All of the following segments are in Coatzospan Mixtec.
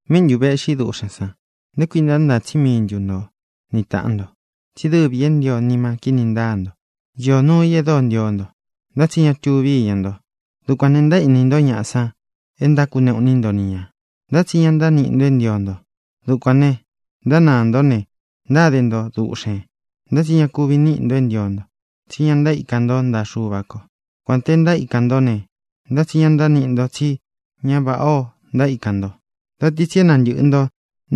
¿Míꞌi ntu vēꞌxí duꞌxēn san? ¿Nté kuī ntánāa tsí mii ntu nto ni tāꞌan nto? Tsí dɨvī é ntio nima kíni ntaa nto. Īó nuu i e dóo ntio nto, ntá tsi ña tuvi íña nto. Dukuān ne, ntaéꞌni nto ñaꞌa san é ntákuneꞌu iní nto ni ñā, ntá tsi ña ntániꞌi nto é ntio nto. Dukuān ne, ntánāa nto ne, ntáde nto duꞌxēn. Ntá tsi ña kuvi níꞌi nto é ntio nto, tsí ña ntaíkan nto ntaꞌa Xuva kō. Kuān te ntaíkan nto ne, ntá tsi ña ntániꞌi nto, tsí ña váꞌa o ntaíkan nto. Da ti tsi é nantɨꞌɨ nto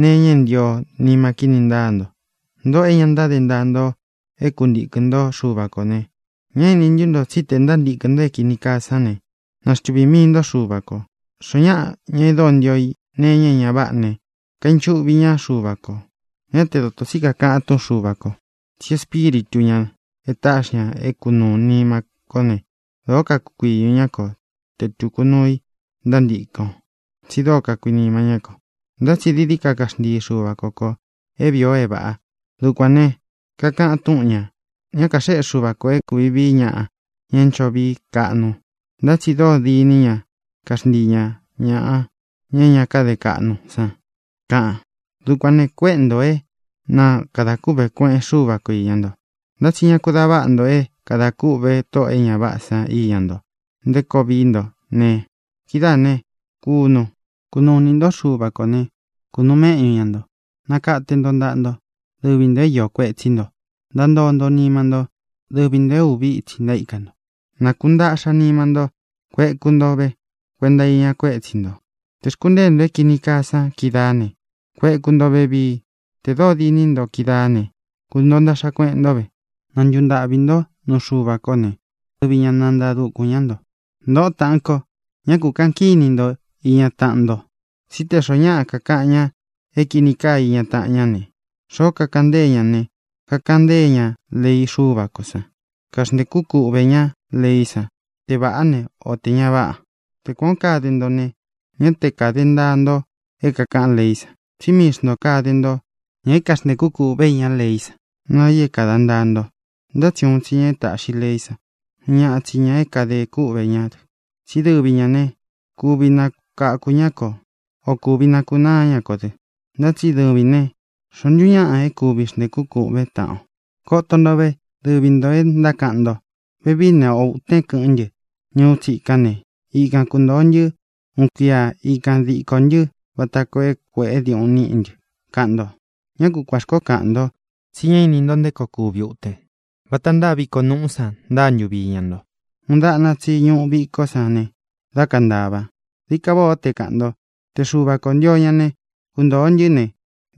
nee iña é ntio nima kíni ntáa nto. Ntōꞌo é ña ntáde ntaa nto é kuntīkɨn ntó Xuva kō ne, ¿ñá ini ntú nto tsí tē ntántīkɨn nto é kīni kaa sán ne, ntáxtuvī mii nto Xuva ko? Xoó ñaꞌa, ña e dóo ntio i nee iña é ña váꞌa ne, kainchuꞌvi ñá Xuva kō. Ñá te dōto tsi kakaꞌan túꞌun Xuva kō tsí Espíritu ñā e táꞌxi ña é kunūu nima kó ne, dōó kakukuiñū ñá ko te tūku nuu i ntántīkɨn o, tsi dóo kakuinima ñá kō. Ntá tsi dií dií ka kaxntii Xuva ko kō é vīi o é vāꞌa. Dukuān ne, kakaꞌan túꞌun ñā: “Ñá kaxéꞌe Xuva kō é kūvi vii ñaꞌa, ña é ncho vií kaꞌnu, ntá tsi dóo diní ña kaxntii ña ñāꞌa, ña é ña káde kaꞌnu san”, kaꞌan. Dukuān ne, kuéꞌe ntō é na kadā kûꞌvé kueꞌen Xúva ko īña nto. Ntá tsi ñá ku dā váꞌa nto é kadā kûꞌve tóꞌō e ña váꞌā san iña nto nté koo vií nto ne, kidáā né, kunu. Kunuu inī ntó Xuva kō né, kunūu méꞌñu ña ntō. Nakate nto ntaꞌa nto, dɨvi ntō é iō kuetsí nto. Ntantoo nto nima ntó, dɨvi ntō é uvi ítsi ntaíka nto. Na kūntaꞌxa nima nto. Kueku nto ve kuenta iña kuétsi ntō. Tē xkuntée nto é kīni kaa san kídaā ne, kueku nto vevii. Tē dóo diní nto kídaā ne, kuntōo ntaꞌxa kueꞌen ntó ve. Na ntuntaꞌvī ntó nuu Xuva kō né, dɨvi ña nantaa dukūn ñá nto. Ntōꞌó taꞌan ko, ñá kū kaꞌan kíni nto iña taꞌan nto. Tsí tē xoó ñaꞌa kakaꞌan ña é kīni kaa iña taꞌan ñá ne, xoó kakaꞌan ntée ña ña ne, kakaꞌan ntée ña lei Xúva kō san. Kaxntēkú kuꞌvē ñá leí san te vāꞌá ne, o tē ña váꞌa. Te kuān o kade nto ne, ñá te kāde ntaa nto é kākaꞌán leí san, tsí mii xntō kade nto ña é kaxntēkú kūꞌve íña leí san naa i é kāda ntaa nto. Ntá tsi uun tsi ña e táꞌxi leí san. Uun ñaꞌa tsi ña é kadē kûꞌvé dɨ. Tsí dɨvi ñā ne, kuvi nakáku ña ko, ō kuvi nakunáa ña kō dɨ. Ntá tsi dɨvīn ne, ¿xoó ntu ñaꞌan é kuvi xntēkún kūꞌvén taꞌan o? Koto nto ve, dɨvi ntō e ntákaꞌan nto: “Vevií ne, ō utén kɨꞌɨn ntɨ́ ñuú tsikán ne, ikan kuntōo ntɨ́ uun kuia. Ikan dīko ntɨ́ vata koo é kuēꞌe diuꞌun níꞌi ntɨ”, kaꞌan nto. Ñá kuān xkoó kaꞌan nto, tsi ñá ini nto nté koo kuvi uten. Vata ntáa viko nuꞌú san ntáa ntuvi iña nto. Uun dáꞌna tsi ñuꞌu vikó san ne, dá kantava. Dií ka váꞌā ó te kāꞌan nto: “Te Xuva kō ntio ña ne, kuntōo ntɨ́ ne,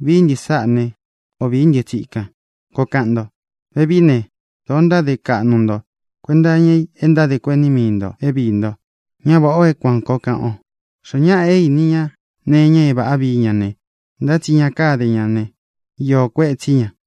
vií ntɨ sáꞌa ne, ō vií ntɨ́ tsikan”, koo kaꞌan nto. Vevií ne, dōo ntáde kaꞌnu nto kuenta iña i e ntádē kuení mii ntō é viī nto. Ña váꞌa ō é kuān koo kaꞌan o. Xoó ñaꞌa é īni ña nee iña é vāꞌá vii ña ne, ntá tsi ña káde ña ne, iō kuetsí ña.